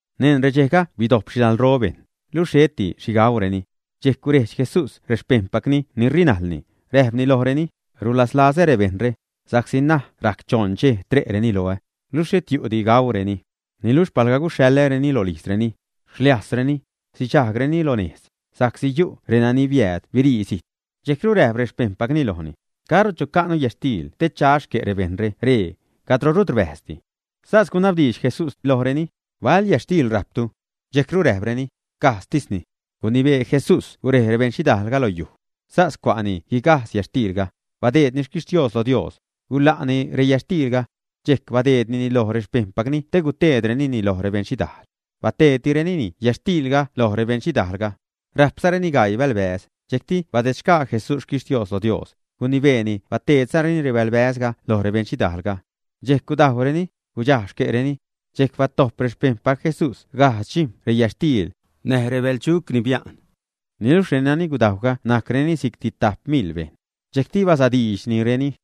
Neṉ redxejga bidojp xhidalro bejṉ, luxh xheti xhigauureni. Dxejc gurejdx Jesús rexpejṉpacni ni rinajlni, räjpni lojreni: ―Rulazlazä rebejṉre, sa'csi ṉaj rajc choṉ dxej tre'reni loä, luxh xhet yu'di gauureni. Niluxh palga guxhaḻäreni rolijzreni, xliajzreni, sidxajgreni lo nejz; sa'csi yu' renani zijtru siäädreni. Dxejcru räjp rexpejṉpacni lojni: ―¿Caro chaca'nu yätxtiil te cha xque' rebejṉre ree, cadro rut rbäjzdi? Sas gunabdiidx Jesús lojreni: ―¿Bal yätxtiil rajptu? Dxejcru räjpreni: ―Gajdztisni. Gunibee Jesús gurej rebeṉxhidaalga loj yuj. Sas cua'ni guigajdx yätxtiilga, badeedni xquixhtios lo Dios, guḻa'ni reyätxtiilga. Dxejc badeednini loj rexpejṉpacni te guteedrenini loj rebeṉxhidaal. Bateedtireni yätxtiilga lo rebeṉxhidaalga. Rajpzareni gaii bälbäz, dxejcti badedsac Jesús xquixhtios lo Dios, gunibeeni bateedzareni rebälbäzre loj rebeṉxhidaalga. Dxejc gudajwreni, gudxaj xque'reni. Dxejc batojp rexpejṉpac Jesús gajdz dxijm̲ reyätxtiil näj rebäjl dxuc ni bia'n. Niluxh renani gudajwga najcreni si'cti tajp mil bejṉ. Dxejcti basadiidxnireni.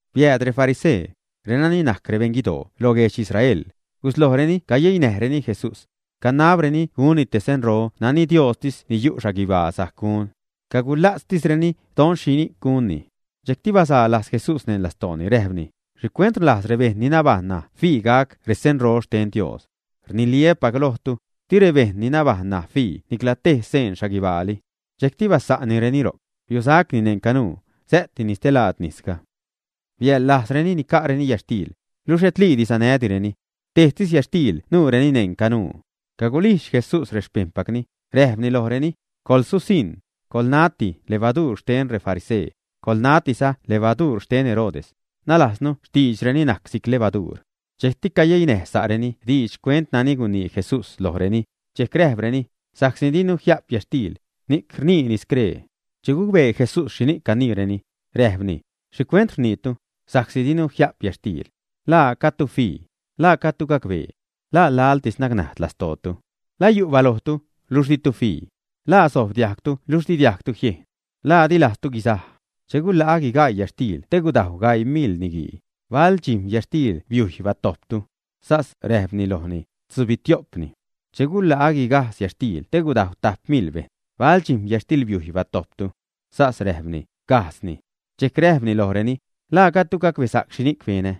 Biääd refarisee, renani najc rebeṉguidoo loj guedx Israel, guslojreni cayeinäjreni Jesús. Canabreni gunni te senro nani Diostis ni yu' guibaa sajc gun. Cagula'tzsireni, don xhi gunni. Dxejcti bazaa lajz Jesús neṉ lastooni, räjpni: ―¿Xhicuent rlajz rebejṉ ni nabajṉ ṉaj fii gac resenro xten Dios? Rniliä́pac lojtu, di rebejṉ ni nabajṉ ṉaj fii nicla tej sen xhaguibaali. Dxejcti basa'nnireni ro'c, biusacni neṉ canuu, sä'tini stelaad nisga. Biaḻlajzreni nica'reni yätxtiil, luxh xhetliidi sanädireni. Tejtis yätxtiil nuureni neṉ canuu. Cagulijdx Jesús rexpejṉpacni, räjpni lojreni: ―Coḻsusiṉ, coḻnati levaduur xten refarisee, coḻnatiza levaduur xten Herodes. (Nalajznu, xtiidxreni najc si'c levaduur.) Dxejcti cayeinäj sa'reni diidx xcuent nani gunii Jesús lojreni, dxejc räjpreni: ―Sa'csi dinu jia'p yätxtiil, ni'c rniini scree. Che gucbee Jesús xhini'c caniireni, räjpni: ―¿Xhicuent rniitu: “Sa'csi dinu jia'p yätxtiil”? ¿La gajdtu fii, la gajdtu gacbee? ¿La laḻtis nacnajd lastootu? ¿La yu' balojtu, luxh ditu fii? ¿La sojb diajgtu luxh di diajgtu jiejn? ¿La dilajztu guizaj? Che guḻa'a guigaii yätxtiil te gudajw gaii mil niguii, ¿bal dxijm̲ yätxtil biujy batojptu? Sas räjpreni lojni: ―Tzubitio'pni. ―Che guḻa'a guigajdz yätxtiil te gudajw tajp mil bejṉ, ¿bal dxijm̲ yätxtil biujy batojptu? Sas räjpreni: ―Gajdzni. Dxejc räjpni lojreni: ―¿La gajdtu gacbesa'c xhi benä?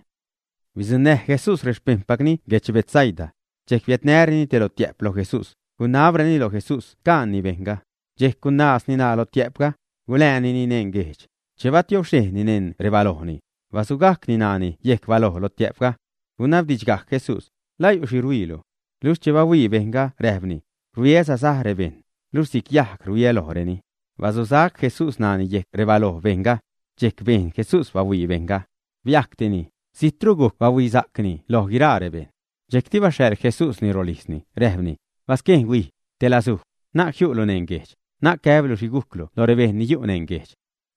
Bidzuṉnäj Jesús rexpejṉpacni guedx Betsaida. Dxejc biädnäreni te lotiä'p loj Jesús, gunabreni loj Jesús caanni bejṉga. Dxejc gunaazni ṉaa lotiä'pga, guläänini neṉ guejdx. Che batiobxhejnni neṉ rebalojni, basugajcni ṉaani yejc baloj lotiä'pga, gunabdidxgajc Jesús: ―¿La yu' xhi rhuiilu, ä? Luxh che bahuii bejṉga räjpni: ―Rhuiä sasaj rebejṉ, luxh si'c yajg rhuiä lojreni. Basusac Jesús ṉaani yejc rebaloj bejṉga. Dxejc bejn Jesús bahuii bejṉga. Biajctini, zijtru gujc bahuisa'cni lo guiraa rebejṉ. Dxejcti baxhaḻ Jesúsni rolijzni, räjpni: ―Basquejn, huijga rolijzlu, na'c jiu'lu neṉ guejdx, na'c gäblu xhi gujclu lo rebejṉ ni yu' neṉ guejdx.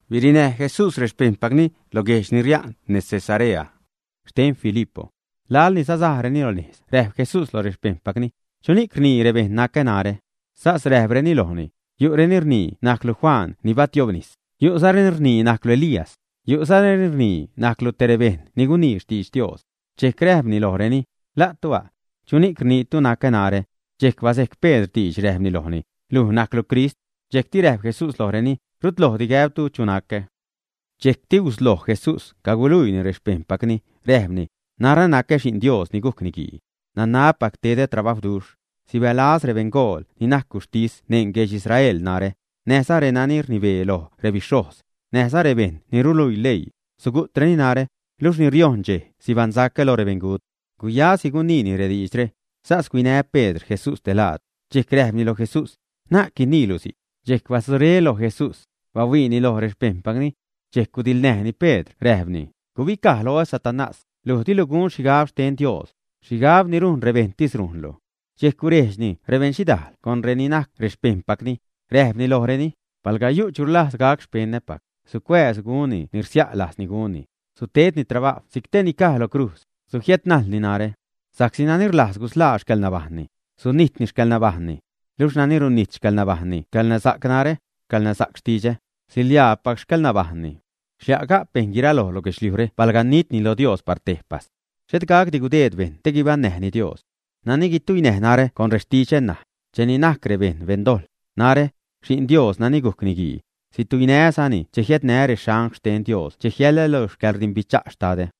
Birinäj Jesús rexpejṉpacni lo reguejdx ni ria'n nez Cesarea xten Filipo. Laḻni sasajreni lo nejz räjp Jesús loj rexpejṉpacni: ―¿Chuni'c rnii rebejṉ nacä narä? Sas räjpreni lojni: ―Yu'reni rnii najclu Juan ni batiobnis, yu'zareni rnii najclu Elías, yu'zareni rnii najclu te rebejṉ ni gunii xtidx Dios. Dxejc räjpni lojreni: ―¿La'tu a'? ¿Chuni'c rniitu nacä narä? Dxejc bazejc Pedr diidx, räjpni lojni: ―Luj najclu Crist. Dxejcti räjp Jesús lojreni: ―Rutlojdi gäbtu chu nacä. Dxejcti gusloj Jesús caguluiini rexpejṉpacni, räjpni: ―Narä nacä Xi'n Dios, ni gujc Niguii. Nanabpac tedä trabajwduxh. Sibälaz rebeṉgool ni najc guxhtis neṉ guedx Israel narä, näjza renani rnibee loj rebixhojz, näjza rebejṉ ni ruluii leii: sugu'treni narä, luxh ni riojṉ dxej guibaṉsacä lo rebeṉgut. Guyasi guniini rediidxre. Sas huinä Pedr Jesús telaad, dxejc räjpni loj Jesús: ―Na'c guiniilu si'c. Dxejc batzuré loj Jesús, bahuiini loj rexpejṉpacni. Dxejc gudiḻṉäjni Pedr räjpni: ―Gubicaj loä, Satanás, luj dilu gun xhigab xten Dios, xhigab ni rujn rebejṉtis rujnlu. Dxejc gurejdxni rebeṉxhidaal con reni najc xpejṉpacni, räjpni lojreni: ―Palga yu' chu rlajz gac xpeṉäpac, sucuääz gunni ni rsia' lajzni gunni, sutedni trabajw si'c tej ni caj lo crujz, sujiädnajlni narä. Sa'csi nani rlajz gusḻaa xcäḻnabajṉni, sunijtni xcäḻnabajṉni. Luxh nani runijt xcäḻnabajṉni xcäḻnasa'c narä, xcäḻnasa'c xtidxä, siḻiaapac xcäḻnabajṉni. Xlia' ga'p bejṉ guiraloj lo guedxliujre palga nitni lo Dios par tejpas. Xhet gacdi gudeed bejṉ te guibaṉnäjni Dios. Nani guituinäj narä con rextidxä ṉaj, cheni najc rebejṉ beṉdojḻ, narä, Xi'n Dios nani gujc Niguii, situinää́zani che jiädnää́ reangl xten Dios che jiälää́ lo xcäḻrdimbicha' Xtadä.